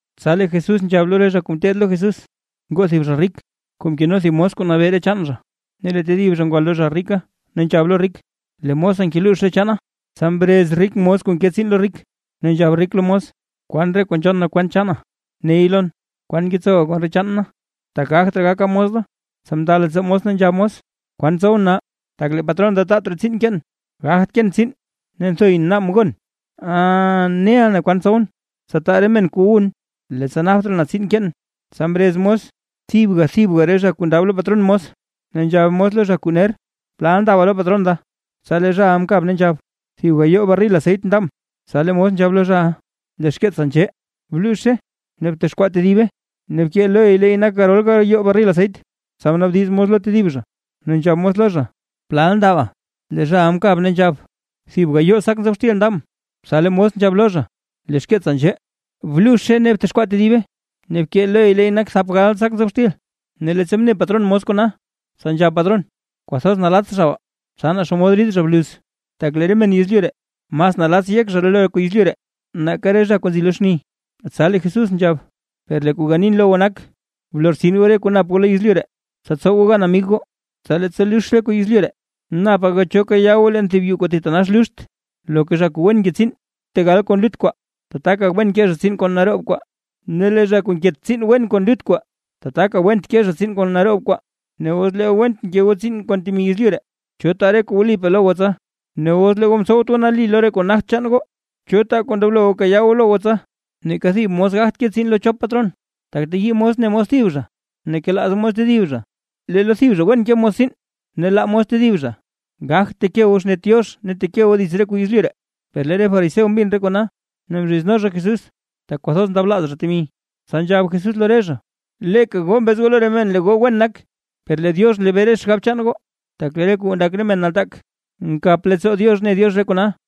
Tsa lee Jesús nzhab lo re zha kuu ngeteed lo Jesús: ―Ngoo thib zha rik kuu mkeno thib mos kuu nabee re chaan zha. Ne lee tedib zha ngwa lo zha rika, ne nzhab lo rik: “Lee mosa ngeluux re chaana”. Tsa mrez rik mos kuu nke tsiin lo rik, ne nzhab rik lo mos: “Kwan re kuu nzhon na kwent chaana, ney lon. ¿Kwan ngetsowa kon re chaan na? Tak gagt raa gaka mos da.” Tsa mnda leettsoo mos ne nzhab mos: “¿Kwan tsowʼn nal, tak lee patron da taat raa tsiin keen? Gagt keen tsiin, ne nthoyʼn naabʼn gon. Ah, neʼa na kwan tsowʼn, tsa taa re men kuu wun, leettsa napt raa na tsiin keen.” Tsa mrez mos thibga thibga re zha kuu ndab lo patron mos, ne nzhab mos lo zha kuu ner: “¿Plal ndaba lo patron da?” Tsa lee zhaʼa mkab ne nzhab: “Thib gayoo barril aseyt ndabʼn”. Tsa lee mos nzhab lo zha: “Lee xkeetsa nzhee, bluuzhe ne btexkwaa tedibe ne bkee loy leey nak garol gayoo barril aseyt”. Tsa mnaabdiz mos lo tedib zha ne nzhab mos lo zha: “¿Plal ndaba?” Lee zhaʼa mkab ne nzhab: “Thib gayoo sak nzob xtil ndabʼn”. Tsa lee mos nzhab lo zha: “Lee xkeetsa nzhee, bluuzhe ne btexkwaa tedibe, ne bkee loy leey nak thap gal sak nzob xtil”. Ne leettsa mne patron mos kona, tsa nzhab patron: “Kwathoz nalatts zha baa, tsa naa xomod rid zha bluz”. Tak lee re men yezlyu ree mas nalatts yek zha lo re kuu yezlyu ree nake re zha kuu nzi lo xni. Tsa lee Jesús nzhab: ―Per lee kuu ganin lo goo nak, blortsin goo re kuu nap goo lo yezlyu ree, tsa tsow goo gan amig goo. Tsa leettsa lux re kuu yezlyu ree, napa goo cho kayaa goo leen thib yuu kuu thitanax luxt. Loka zha kuu wen nke tsiin tegal kon lut kwaa, tataka wen ke zha tsiin kon naroob kwaa, ne lee zha kuu nket tsiin wen kon lut kwaa, tataka went ke zha tsiin kon naroob kwaa. Ne os lee goo went mke goo tsiin kon temi yezlyu ree, ¿cho taa re kuu wlipaa lo goo tsa? Ne os lee goo mtsowt goo nali lo re kuu nagt chaan goo, ¿cho taa kuu ndoblo kayaa goo lo goo tsa? Neeka thib mos gagt ke tsiin lo chop patron, tak teyii mos ne mos thib zha ne kelaaz mos tedib zha, lee lo thib zha wen ke mos tsiin ne laa mos tedib zha. Gagt teke goo xnet Diox ne teke goo dits re kuu yezlyu ree. Per lee re fariseo mbin re kona, ne mzhizno zha Jesús, tak kwathoz ndablaaz zha temi. Tsa nzhab Jesús lo re zha: ―Leeka goo mbez goo lo re men lee goo wen nak, per lee Diox nlebee re xgab chaan goo; tak lee re kuu ndak re men nataak, nkap leettsoo Diox ne Diox re kona.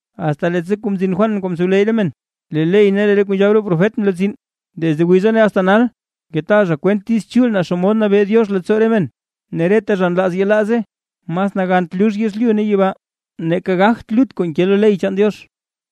’Asta leettsa mzin Juan kuu mtsowleyy re men, lee ley ne re kuu nzhab re profet mlortsin. Desde wiza asta nal ngetaa zha kwent Diiz Chul naa xomod nabee Diox leettsoo re men, ne reta zha nlaaz yelaaze. Mas nagant lux yezlyu ne yibaa, nake gagt lut kuu nke lo ley chaan Diox.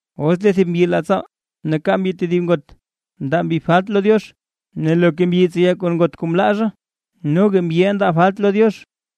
’Os lee thib mbyi laa tsaal, ne kaa mbyi tedib ngot, ndaa mbyi falt lo Diox, ne loka mbyi kuu tseya kon ngot kuu mlaa zha, noga mbyiʼa ndaa falt lo Diox.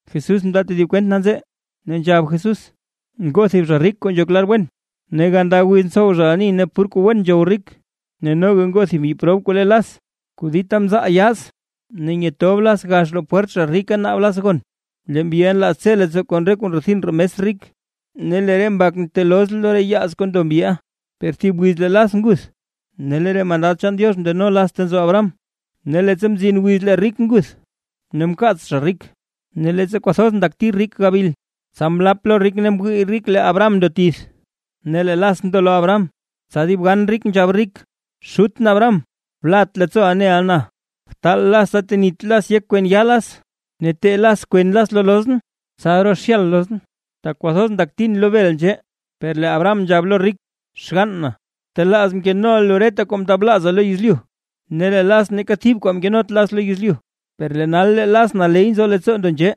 Jesús mndaa tedib kwent nanzee, ne nzhab Jesús: ―Ngoo thib zha rik kuu nzhok lar wen, ne ganda wiz ntsow ani ne pur kuu wen nzhow rik. Ne noga ngoo thib mbyi prob kuu le Las, kuu dita mzaal yaaz, ne nyatob Las gax roo pwert zha rika, naab Las gon. Lee mbyiʼa nlaaz tse leettsoo kon re kuu ndrethin roo mes rik. Ne lee re mbak nteeloz lo re yaaz kuu ndo mbyiʼa. Per thib wiz lee Las nguth, ne lee re mandad chaan Diox mndeno Las ta nzo Abraham. Ne leettsa mzin wiz lee rik nguth ne mkaats zha rik. ’Ne leettsa kwathoz ndakti rik gabil, tsa mlap lo rik ne mwii rik lee Abraham ndo tith, ne lee Las ndo lo Abraham. Tsa dib gan rik nzhab rik: “Xutʼn Abraham, blat leettsooʼa neʼa na. Btaal Las tsa tenit Las yek kwen yaa Las, ne tee Las kwen Las lo lozʼn, tsa rozhyal lozʼn, tak kwathoz ndaktin lo bel nzhee.” Per lee Abraham nzhab lo rik: “Xgann na, btelaaz mkenoʼa lu reta kuu mndablaaza lo yezlyu, ne lee Las neeka thib kuu mkenot Las lo yezlyu, per nal lee Las naley nzo leettsoo ndo nzhee,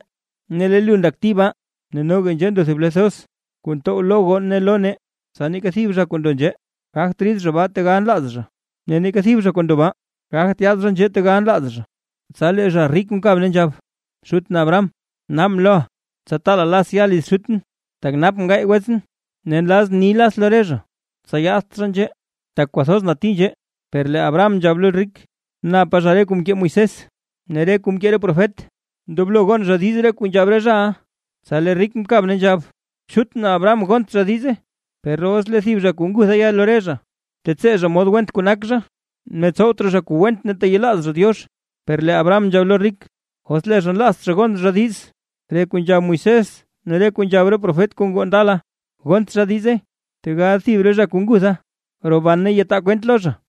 ne lee lu ndakti baa. Ne noga, nzhee nzo thib ble thoz kuu ntow lo goo ne lo nee, tsa neeka thib zha kuu ndo nzhee gagt rid baa tegal nlaaz zha, ne neeka thib zha kuu ndo baa, gagt yaad nzhee tegal nlaaz zha.” ’Tsa lee zha rik mkab ne nzhab: “Xutʼn Abraham, naabʼn loʼa, tsa taala Las ya liz xutʼn, tak napʼn gaay wetsʼn, ne nlazʼn ni Las lo re zha, tsa yaadt zha nzhee, tak kwathoz nati nzhee”. Per lee Abraham nzhab lo rik: “Napa zha re kuu mkee Moisés ne re kuu mkee re profet; ndoblo gon zha diiz re kuu nzhab re zhaʼa”. Tsa lee rik mkab ne nzhab: “Xutʼn Abraham, gont zha diize, per os lee thib zha kuu ngutha ya lo re zha, tetsee zha mod went kuu nak zha ne tsowt raa zha kuu went ne teyelaaz zha Diox”. Per lee Abraham nzhab lo rik: “Os lee zha nlaazt zha gon zha diiz, re kuu nzhab Moisés ne re kuu nzhab re profet kuu ngoo ndala, gont zha diize, tegal thib re zha kuu ngutha roban ne yataa kwent lo zha”.